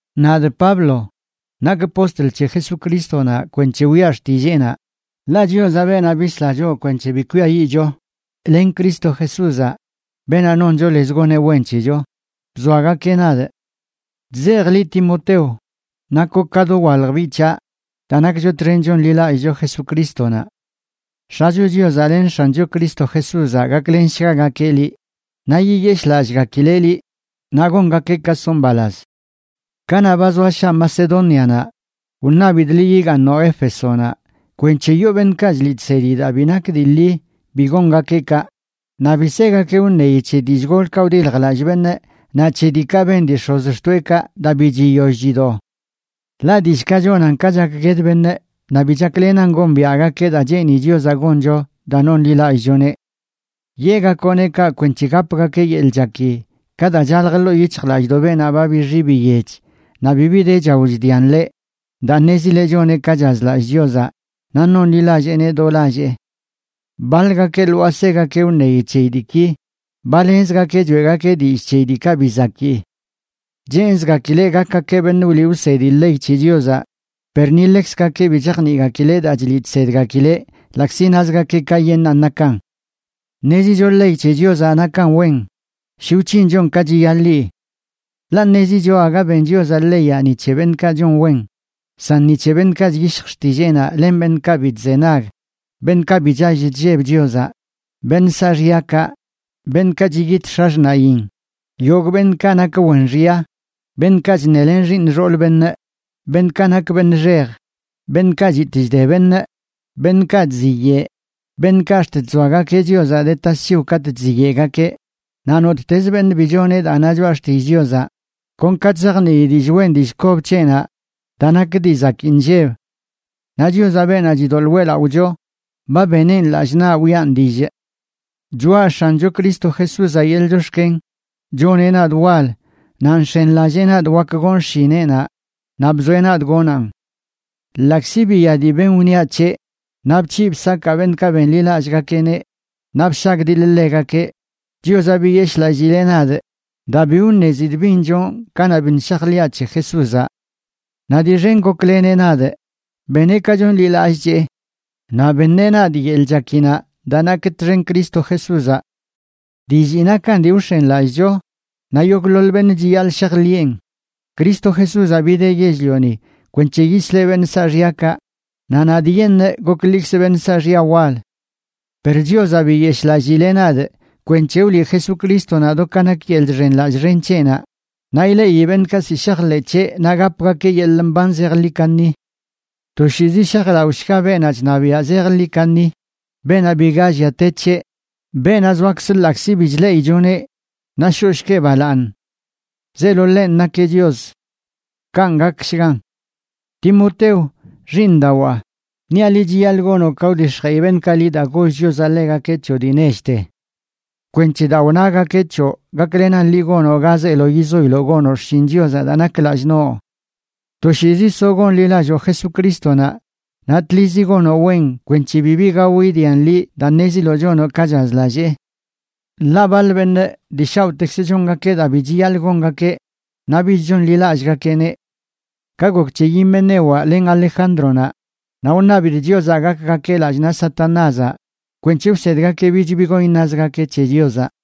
Nadꞌ Pablo, nakꞌ postl c̱he Jesucrístonaꞌ kwenc̱he wiꞌa xtilleenaꞌ, ḻaꞌ Chiozaꞌ, beenaꞌ bisla choꞌ kwenc̱he bi kwiayiꞌcho, len Cristo Jesúzaꞌ, beenaꞌ noncho lez goneꞌ wen c̱hecho, bzoagakeꞌ nadꞌ. Chzejꞌ liꞌ, Timoteo, nakoꞌ ka dowalj biꞌ c̱haꞌ daa nakcho txen chonḻilallꞌcho Jesucrístonaꞌ. X̱acho Chiozaꞌ len X̱ancho Cristo Jesúzaꞌ gaklenshgagakeꞌ liꞌ, naꞌ yiyeshꞌlallꞌgakileꞌ liꞌ, naꞌ gongakeꞌ ka soꞌ mbalaz. Kanaꞌ ba zoa shaa Macedónianaꞌ, wṉabidꞌ liꞌ yigaaṉoꞌ Éfesonaꞌ kwenc̱he yoo beṉꞌkaꞌ chliꞌ chsedi daa bi nak dii ḻi bi gongakeꞌ kaꞌ, naꞌ bi segakeꞌ wṉeyi c̱he dillꞌ golkaꞌ wdiljlallꞌ beṉꞌ naꞌ c̱he diikaꞌ ben dii x̱ozxtoeꞌkaꞌ daa bi chiyoll chido. Ḻaꞌ dillꞌkaꞌ chonan ka chakgued beṉꞌ naꞌ bi chaklenan gombiaꞌgakeꞌ daa cheeni Chiozaꞌ goncho daa nonḻilallꞌchoneꞌ. Yeꞌgakoꞌneꞌ kaꞌ kwenc̱he gapgakeꞌ yeḻꞌ chaki ka daa chalj ḻoo yic̱hjlallꞌdoꞌ beenaꞌ ba bixi biyech naꞌ bibi de chao chdian ḻeꞌ daa ṉezileꞌ choneꞌ ka chazlallꞌ Chiozaꞌ naꞌ nonḻilalleeneꞌ do lallee. Baḻgakeꞌ lwaa segakeꞌ wṉeyi c̱heyi diiki, ba lenzgakeꞌ choeꞌgakeꞌ dillꞌ c̱heyi diikaꞌ bi zakii. Cheenzgakileꞌ gakgakeꞌ beṉꞌ wliꞌ wsedi ley c̱he Chiozaꞌ, per ni ḻekzgakeꞌ bi chajniꞌgakileꞌ daa chliꞌ chsedgakileꞌ ḻaꞌkzi nazgakeꞌ kayeṉꞌnan nakan. Ṉezicho ley c̱he Chiozaꞌ nakan wen, shi wc̱hinchon ka chiyaḻi. Ḻaꞌ ṉezicho aga ben Chiozaꞌ leyaꞌ ni c̱he beṉꞌkaꞌ chon wen, san ni c̱he beṉꞌkaꞌ chyishj xtilleenaꞌ len beṉꞌkaꞌ bi chzenag, beṉꞌkaꞌ bi chall chlleb Chiozaꞌ, beṉꞌ saaxyakaꞌ, beṉꞌkaꞌ chiyit x̱axṉaꞌyin, yogꞌ beṉꞌkaꞌ nak wen xya, beṉꞌkaꞌ chṉelen xiiṉ xool beṉꞌ, beṉꞌkaꞌ nak beṉꞌ xej, beṉꞌkaꞌ chitꞌ chde beṉꞌ, beṉꞌkaꞌ chziyeꞌ, beṉꞌkaꞌ ax̱t chzoagakeꞌ Chiozaꞌ de tasc̱hiw katꞌ chziyeꞌgakeꞌ, naꞌ nottez beṉꞌ bi choneꞌ daa na choꞌa xtillꞌ Chiozaꞌ kon ka chzajnii dillꞌ wen dillꞌ kob c̱heꞌnaꞌ daa nak dii zakii nlleb. Naꞌ Chiozaꞌ, beenaꞌ chidoḻꞌ weꞌlaꞌocho, ba beneꞌn lallꞌ naꞌ wiꞌan dillꞌ. Choꞌa X̱ancho Cristo Jesúzaꞌ yeḻꞌ chox̱ken choneꞌ nadꞌ wal, naꞌ nx̱enlallee nadꞌ wak gon xshineꞌnaꞌ, naꞌ bzoeꞌ nadꞌ gonaꞌn. Ḻaꞌkzi biya dii ben wṉiaꞌ c̱heꞌ, naꞌ bc̱hiꞌ bsakaa beṉꞌkaꞌ benḻilallꞌgakeꞌneꞌ naꞌ bshagdiḻꞌ ḻegakeꞌ, Chiozaꞌ biyeshꞌlallileꞌ nadꞌ daa bi wṉezidꞌ bin chonꞌ kanaꞌ biṉꞌ shajḻiꞌa c̱he Jesúzaꞌ. Naꞌ dii xen gokleneꞌ nadꞌ, beneꞌ ka chonḻilallꞌchee naꞌ beṉeꞌ nadꞌ yeḻꞌ chakinaꞌ daa nakꞌ txen Cristo Jesúzaꞌ. Dillii nakan dii wx̱enlallꞌcho, naꞌ yogꞌḻoḻ beṉꞌ chiyaḻꞌ shajḻiꞌen: Cristo Jesúzaꞌ bideꞌ yell-lioni kwenc̱he yisleꞌ beṉꞌ saaxyakaꞌ, naꞌ nadꞌyeṉꞌ goklikzꞌ beṉꞌ saaxya wal. Per Chiozaꞌ biyeshꞌlallileꞌ nadꞌ kwenc̱he wliꞌ Jesucrístonaꞌ do ka nak yeḻꞌ chxenḻallꞌ xen c̱heꞌnaꞌ naꞌ ileꞌi beṉꞌkaꞌ ziꞌ shajḻeꞌ c̱heꞌ naꞌ gapgakeꞌ yeḻꞌ mban zejḻi kaṉi. Toshiizi shajlaꞌoshga beenaꞌ chṉabiaꞌ zejḻi kaṉi, beenaꞌ biga llia te c̱heꞌ, beenaꞌ zoakz ḻaꞌkzi bi chleꞌichoneꞌ, naꞌ shoꞌshgueꞌ balaaṉ. Zeelo ḻenꞌ nakeꞌ Chios. Kanꞌ gakshgan. Timoteo, xiiṉdawaa, niaꞌ liꞌ chiyaḻꞌ gonoꞌ ka wdix̱jeꞌi beṉꞌkaꞌ liꞌ daa goll Chiozaꞌ ḻegakeꞌ c̱hoꞌ dii nechte, kwenc̱he daa wnagakeꞌ c̱hoꞌ gaklenan liꞌ gonoꞌ ga zeelo yizoiloꞌ gonoꞌ xshin Chiozaꞌ daa nak lallꞌ noꞌ. Toshiizi soꞌ gonḻilalloo Jesucrístonaꞌ naꞌ tlizi gonoꞌ wen kwenc̱he bibi gao idian liꞌ daa ṉeziloꞌ chonoꞌ ka chazlallee. Ḻaꞌ baḻ beṉꞌ dii shaoꞌtekzə chongakeꞌ daa bi chiyaḻꞌ gongakeꞌ naꞌ bich chonḻilallꞌgakeꞌneꞌ. Ka gok c̱he Himenewaꞌ len Alejándronaꞌ, naꞌ wṉabidꞌ Chiozaꞌ gakgakeꞌ lallꞌ naꞌ Satanázaꞌ kwenc̱he wsedgakeꞌ bich bi gon iṉazgakeꞌ c̱he Chiozaꞌ.